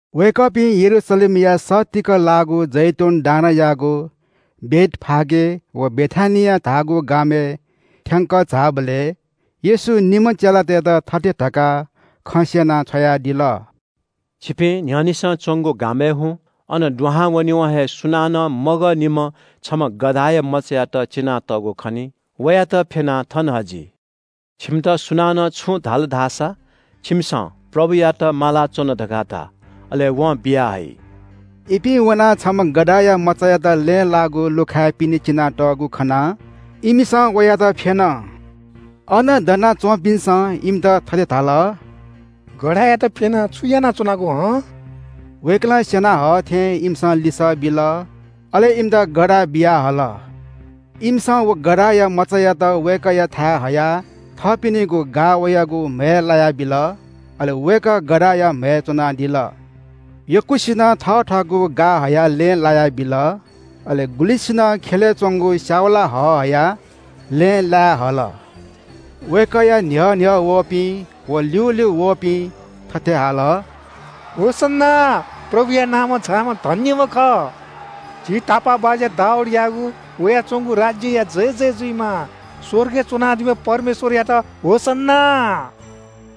वय्‌कःपिं यरूशलेमया सत्तीक लाःगु जैतून डाँडायागु बेथफागे व बेथानिया धाःगु गामय् थ्‍यंकः झाःबलय् येशूं निम्‍ह चेलातय्‌त थथे धकाः खँ स्‍यनाः छ्वयादिल – “छिपिं न्‍ह्यःनेसं च्‍वंगु गामय् हुँ। अन दुहां वनेवं हे सुनानं मगःनिम्‍ह छम्‍ह गधाया मचायात चिनातःगु खनी। वयात फ्‍यनाः थन हजि। छिमित सुनानं छुं धाल धाःसा, छिमिसं – ‘प्रभुयात माला च्‍वन’ धकाः धा। अले वं बिया हइ।” इपिं वनाः छम्‍ह गधाया मचायात लँय् लाःगु लुखाय् पिने चिनातःगु खनाः इमिसं वयात फ्‍यन। अन दना च्‍वंपिन्‍सं इमित थथे धाल – “गधायात फ्‍यनाः छु यानाच्‍वनागु हं?” वय्‌कलं स्‍यना हः थें इमिसं लिसः बिल। अले इमित गधा बियाहल। इमिसं व गधाया मचायात वय्‌कःयाथाय् हयाः थःपिनिगु गा वयागु म्‍हय् लायाबिल। अले वय्‌कः गधाया म्‍हय् च्‍वनादिल। यक्‍वसिनं थथःगु गा हयाः लँय् लायाबिल, अले गुलिसिनं ख्‍यलय् च्‍वंगु स्‍याउला हः हयाः लँय् लाय् हल। वय्‌कःया न्‍ह्यः न्‍ह्यः वंपिं व ल्‍यूल्‍यू वःपिं थथे हाल – “होसन्‍ना, प्रभुया नामं झाःम्‍ह धन्‍यम्‍ह खः। झी तापाःबाज्‍या दाऊदयागु वयाच्‍वंगु राज्‍यया जयजय जुइमा। स्‍वर्गय् च्‍वनादीम्‍ह परमेश्‍वरयात होसन्‍ना।”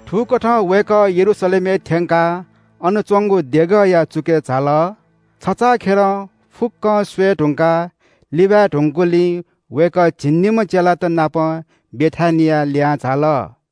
थुकथं वय्‌कः यरूशलेमय् थ्‍यंकाः अन च्‍वंगु देगःया चुकय् झाल। छचाःखेलं फुक्‍कं स्‍वये धुंकाः लिबाय् धुंकूगुलिं वय्‌कः झिंनिम्‍ह चेलात नाप बेथानियाय् लिहां झाल।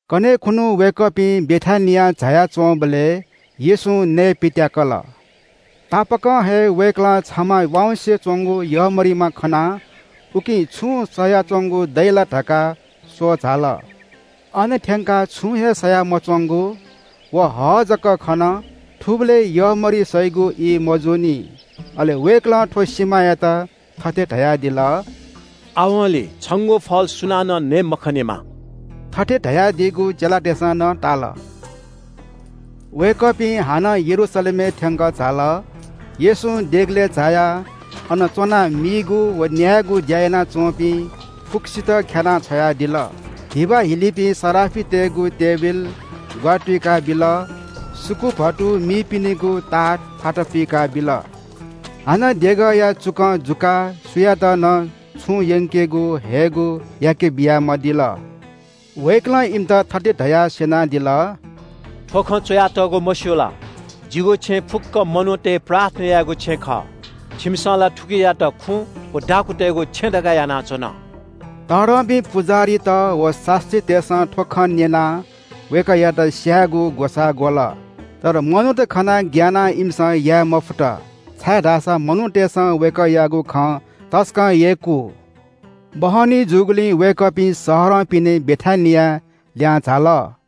कन्‍हय् खुन्‍हु वय्‌कःपिं बेथानियां झाया च्‍वंबलय् येशूं नयेपित्‍याकल। तापाकं हे वय्‌कलं छमा वाँउसे च्‍वंगु यःमरिमा खनाः उकी छुं सयाच्‍वंगु दइ ला धकाः स्‍वः झाल। अन थ्‍यंकाः छुं हे सया मच्‍वंगु व हः जक खन। थुबलय् यःमरि सइगु ई मजूनि। अले वय्‌कलं थ्‍व सिमायात थथे धयादिल – “आवंलि छंगु फल सुनानं नये मखनेमा।” थथे धयादीगु चेलातय्‌सं नं ताल। वय्‌कःपिं हानं यरूशलेमय् थ्‍यंकः झाल। येशूं देगलय् झायाः अन च्‍वनाः मीगु व न्‍यायेगु ज्‍या यानाच्‍वंपिं फुक्‍कसितं ख्‍यानाः छ्वयादिल। धिबा हिलीपिं सराफितय्‌गु टेबिल ग्‍वारा तुइकाबिल, सुकुभतु मीपिनिगु ताथ फाता पुइकाबिल। हानं देगःया चुकं जुकाः सुयातं नं छुं यंकेगु हयेगु याकेबिया मदिल। वय्‌कलं इमित थथे धयाः स्‍यनादिल – “थ्‍व खँ च्‍वयातःगु, मस्‍यू ला? ‘जिगु छेँ फुक्‍क मनूतय् प्रार्थना याइगु छेँ खः।’ छिमिसं ला थुकियात खुँ व दाखुँतय्‌गु छेँ धकाः यानाच्‍वन।” तःधंपिं पुजाहारीत व शास्‍त्रीतय्‌सं थ्‍व खँ न्‍यनाः वय्‌कःयात स्‍यायेगु ग्‍वसाः ग्‍वल। तर मनूत खनाः ग्‍यानाः इमिसं याये मफुत, छाय्‌धाःसा मनूतय्‌सं वय्‌कःयागु खँ तसकं यय्‌कू। बहनी जूगुलिं वय्‌कःपिं शहरं पिने बेथानियाय् लिहां झाल।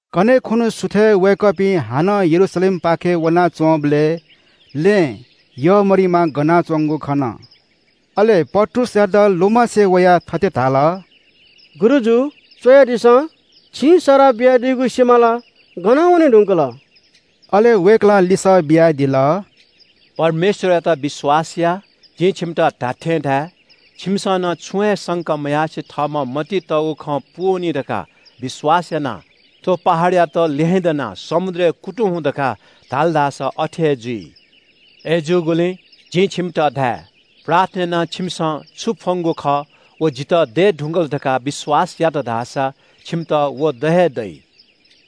कन्‍हय् खुन्‍हु सुथय् वय्‌कःपिं हानं यरूशलेमपाखें वनाच्‍वंबलय् लँय् यःमरिमा गना च्‍वंगु खन। अले पत्रुसयात लुमंसे वयाः थथे धाल – “गुरुजु, स्‍वयादिसँ, छिं सराः बियादीगु सिमा ला गनावने धुंकल।” अले वय्‌कलं लिसः बियादिल – “परमेश्‍वरयात विश्‍वास या। जिं छिमित धात्‍थें धाये – छिमिसं नं छुं हे संका मयासें थःम्‍हं मतिइ तःगु खँ पूवनी धकाः विश्‍वास यानाः थ्‍व पहाडयात ‘ल्‍यहेँ दनाः समुद्रय् कुतुं हुँ’ धकाः धाल धाःसा अथे हे जुइ। अय्‌जूगुलिं जिं छिमित धाये – प्रार्थना यानाः छिमिसं छु फ्‍वंगु खः व जितः दये धुंकल धकाः विश्‍वास यात धाःसा छिमित व द हे दइ।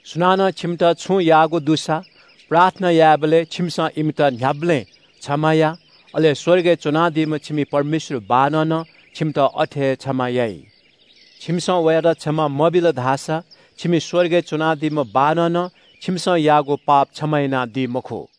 सुनानं छिमित छुं याःगु दुसा प्रार्थना यायेबलय् छिमिसं इमित न्‍ह्याबलें क्षमा या, अले स्‍वर्गय् च्‍वनादीम्‍ह छिमि परमेश्‍वर बाःनं नं छिमित अथे हे क्षमा याइ। छिमिसं वयात क्षमा मबिल धाःसा छिमि स्‍वर्गय् च्‍वनादीम्‍ह बाःनं नं छिमिसं याःगु पाप क्षमा यानादी मखु।”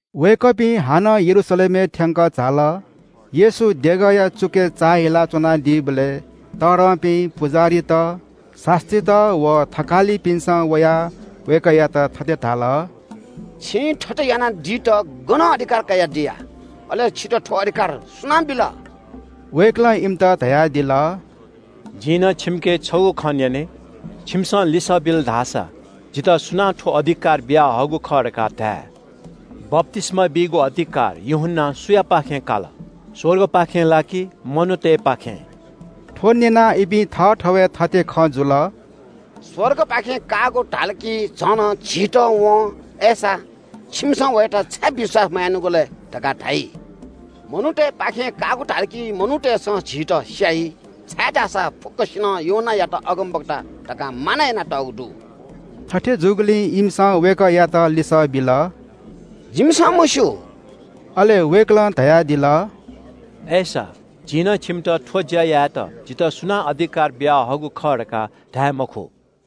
वय्‌कःपिं हाकनं यरूशलेमय् थ्‍यंकः झाल। येशू देगःया चुकय् चाःहिला च्‍वनादीबलय् तःधंपिं पुजाहारीत, शास्‍त्रीत, व थकालिपिन्‍सं वयाः वय्‌कःयात थथे धाल – “छिं थथे याना दित गनं अधिकार कयादिया? अले छितः थ्‍व अधिकार सुनां बिल?” वय्‌कलं इमित धयादिल – “जिं नं छिमिके छगू खँ न्‍यने, छिमिसं लिसः बिल धाःसा जितः सुनां थ्‍व अधिकार बियाहःगु खः धकाः धाये। बप्‍तिस्‍मा बीगु अधिकार यूहन्‍नां सुयापाखें काल? स्‍वर्गपाखें ला कि मनूतय्‌पाखें?” थ्‍व न्‍यनाः इमि थःथवय् थथे खँ जुल – “स्‍वर्गपाखें काःगु धाल कि झन झीत वं ‘अय्‌सा, छिमिसं वयात छाय् विश्‍वास मयानागु लय्?’ धकाः धाइ। मनूतय्‌पाखें काःगु धाल कि मनूतय्‌सं झीत स्‍याइ, छाय्‌धाःसा फुक्‍कसिनं यूहन्‍नायात अगमवक्ता धकाः मानय् यानातःगु दु।” थथे जूगुलिं इमिसं वय्‌कःयात लिसः बिल – “जिमिसं मस्‍यू।” अले वय्‌कलं धयादिल – “अय्‌सा, जिं नं छिमित थ्‍व ज्‍या यायेत जितः सुनां अधिकार बियाहःगु खः धकाः धाये मखु।”